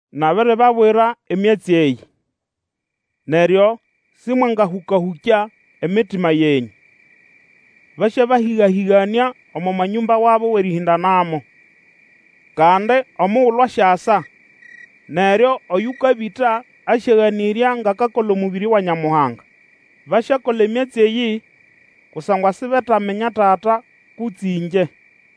Nabiribabwira emyatsi eyĩ, neryo simwangahũka-hũkya emitima yenyũ. Basyabahiga-hĩganĩa omo manyũmba wabo wʼerĩhĩndanamo. Kandi omugulu asyasa, neryo oyukabĩta asyaganĩrya ngʼakakola omũbĩrĩ wa Nyamuhanga. Basyakola emyatsi eyĩ, kusangwa sibetaminya Tata kutse ĩngye.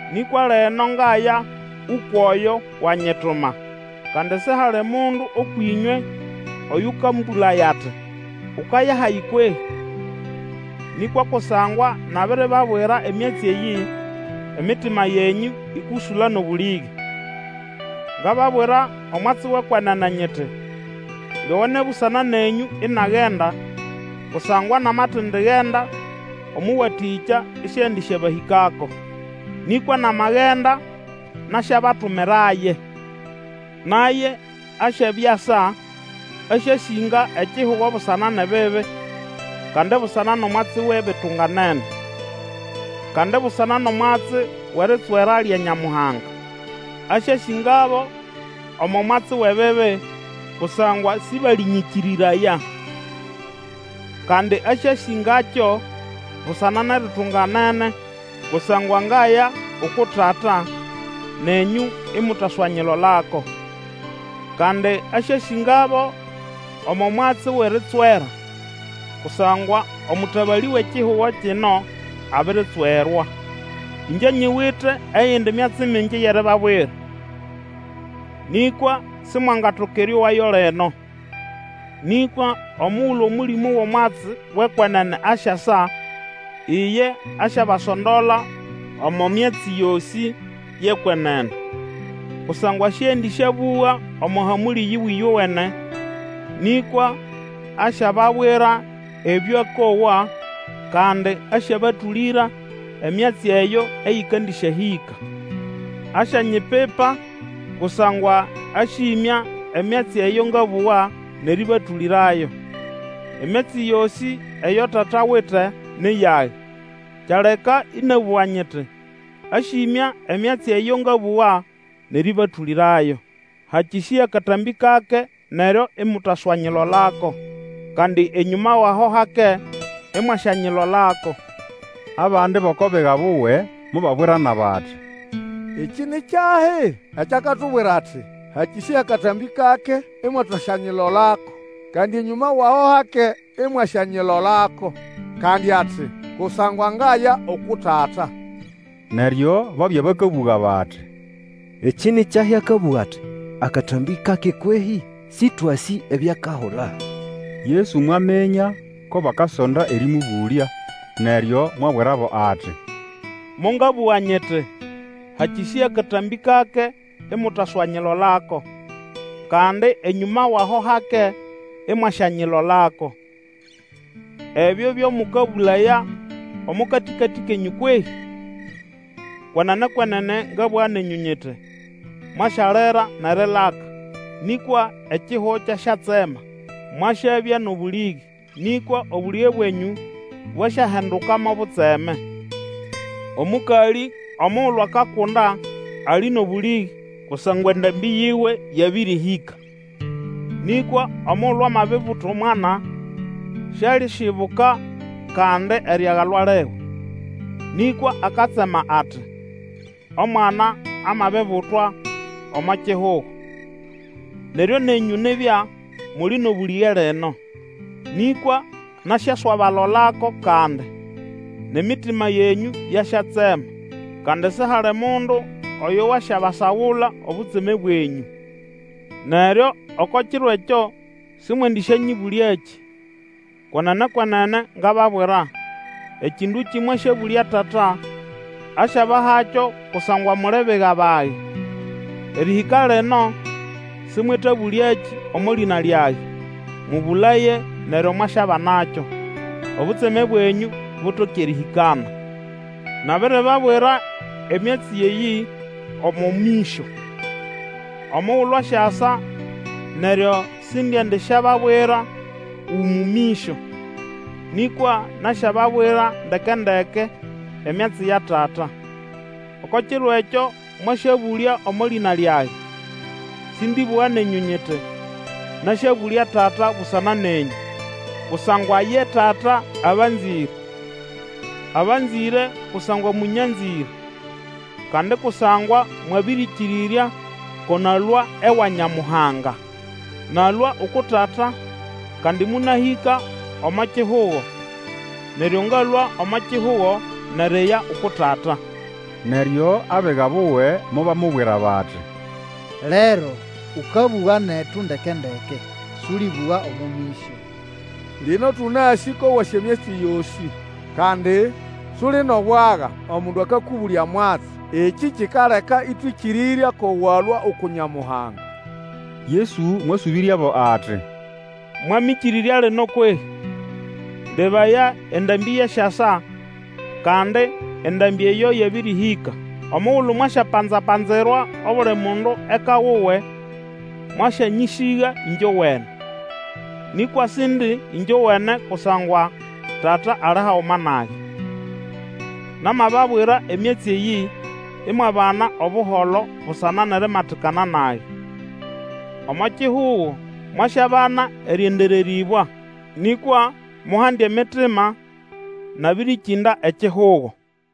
Nĩkwa lino ngaya ukwʼoyo wanyituma; kandi sihali mundu ũkwʼĩnywe oyũkambũlaya ati, Ukaya hahi kwehĩ? Nĩkwa kusangwa nabiribabwira emyatsi eyĩ, emitima yenyũ ĩkũsũla nʼobũlĩge. Ngababwira omwatsi wʼekwenene nyiti, Lyowene busana nenyũ inagenda, kusangwa namatendigenda, Omũwatĩkya isiendisyabahĩkako. Nĩkwa namagenda nasyabatumiraye. Naye asyabya asa, asyasĩnga ekihugo busana nʼebibi, kandi busana nʼomwatsi wʼebitunganene, kandi busana nʼomwatsi wʼeritswera lya Nyamuhanga. Asyasĩngabo omo mwatsi wʼebibi, kusangwa sĩbalĩnykĩrĩraya. Kandi asyasĩngakyo busana nʼeritunganene, kusangwa ngaya uku Tata, nenyũ imutaswanyilolako. Kandi asyasĩngabo omo mwatsi wʼeritswera, kusangwa omũtabalĩ wʼekihugo kino abiritswerwa. Ĩngye nyiwite eyindi myatsi mingi yʼeribabwira, nĩkwa Simwangatoka erĩowayo lino. Nĩkwa omugulu Omũlĩmũ wʼomwatsi wʼekwenene asyasa, iye asyabasondola omo myatsi yosĩ yʼekwenene, kusangwa siendĩsyabũga omo hamũlĩ yiwe ĩyowene, nĩkwa asyababwira ebyo akowa, kandi asyabatũlĩra emyatsi eyo eyĩkandĩsyahĩka. Asyanyipipa, kusangwa asyimya emyatsi eyo ngabũga nʼerĩbatũlĩrayo. Emyatsi yosĩ eyo Tata awite ni yage; kyaleka ĩnabũga nyiti, Asyĩmya emyatsi eyo ngabũga, nʼerĩbatũlĩrayo. Hakĩsĩya katambĩ kake, neryo imutaswanyilolako; kandi enyũma wʼaho hake, imwasyanyilolako. Abandi bʼoko biga buwe mobabwirana bati, Ekĩ ni kyahi? Ekyo akatubwira ati, Hakĩsĩya katambĩ kake imutaswanyilolako; kandi enyũma wʼaho hake, imwaswanyilolako. Kandi ati, Kusangwa ngaya uku Tata. Neryo babya bakabũga bati, Ekĩ ni kyahi akabũga ati, Akatambĩ kake kwehĩ? Sĩtwasĩ ebyo akahula. Yesu mwaminya ko bakasonda erĩmũbũlya, neryo mwabwirabo ati, Mongabũga nyiti, Hakĩsĩya katambĩ kake, imutaswanyilolako, kandi enyũma wʼaho hake, imwasyanyilolako. Ebyo byo mũkabũlaya omo katĩkatĩ kenyũ kwehĩ? Kwenene, kwenene ngabũga nenyũ nyiti, Mwasyalira nʼerilaka, nĩkwa ekihugo kyasyatsema. Mwasyabya nʼobũlĩge, nĩkwa obũlĩge bwenyũ bwasyahinduka mo butseme. Omũkalĩ omugulu akakunda ali nʼobũlĩge kusangwa endambĩ yiwe yabĩrĩhĩka; nĩkwa omugulu amabibuta omwana, sialisyibuka kandi eriagalwa liwe, nĩkwa akatsema ati, Omwana amabibutwa omo kihugo. Neryo, nenyũ nibya muli nʼobũlĩge lino; nĩkwa nasyaswabalolako kandi, nʼemitima yenyũ yasyatsema, kandi sihali mundu oyo wasyabasagula obutseme bwenyũ. Neryo oko kiro ekyo sĩmwendĩsyanyĩbũlyakĩ. Kwenene, kwenene ngababwira, Ekĩndũkĩ mwasyabũlya Tata, asyabahakyo kusangwa muli biga bage. Erĩhĩka lino, sĩmwetabũlyakĩ omo lĩna lyage; mũbũlaye, neryo mwasyabanakyo, obutseme bwenyũ butoke erĩhĩkana. Nabiribabwira emyatsi eyĩ omo mĩsyo. Omugulu asyasa neryo sindiendisyababwira umu mĩsyo, nĩkwa nasyababwira ndeke-ndeke emyatsi ya Tata. Oko kiro ekyo, mwasyabũlya omo lĩna lyage; sĩndĩbũga nenyũ nyiti, Nasyabũlya Tata busana nenyũ; kusangwa ye Tata abanzĩre. Abanzĩre kusangwa mũnyanzĩre, kandi kusangwa mwabĩrĩkĩrĩrya ko nalũa ewa Nyamuhanga. Nalũa uku Tata, kandi monahĩka omo kihugo; neryo ngalũa omo kihugo nʼeriya uku Tata. Neryo abiga buwe mobamubwira bati, Lero, ũkabũga netu ndeke-ndeke, sũlĩbũga omo mĩsyo. Lino tũnasĩ ko wasĩ emyatsi yosĩ, kandi, suli nʼobwaga omundu akakũbũlya mwatsi. Ekĩ kikaleka ĩtwĩkĩrĩrya ko walũa uku Nyamuhanga. Yesu mwasũbĩryabo ati, Mwamĩkĩrĩrya lino kwehĩ? Lebaya, endambĩ yasyasa, kandi endambĩ eyo yabĩrĩhĩka, omugulu mwasyapanza-panzirwa obuli mundu eka wuwe, mwasyanyĩsĩga ĩngyowene. Nĩkwa Sindi ĩngyowene, kusangwa Tata ali haguma nage. Namababwira emyatsi eyĩ imwabana Obuholo busana nʼerimatikana nage. Omo kihugo mwasyabana erĩendererĩbwa. Nĩkwa muhande emitima! Nabĩrĩkĩnda ekihugo!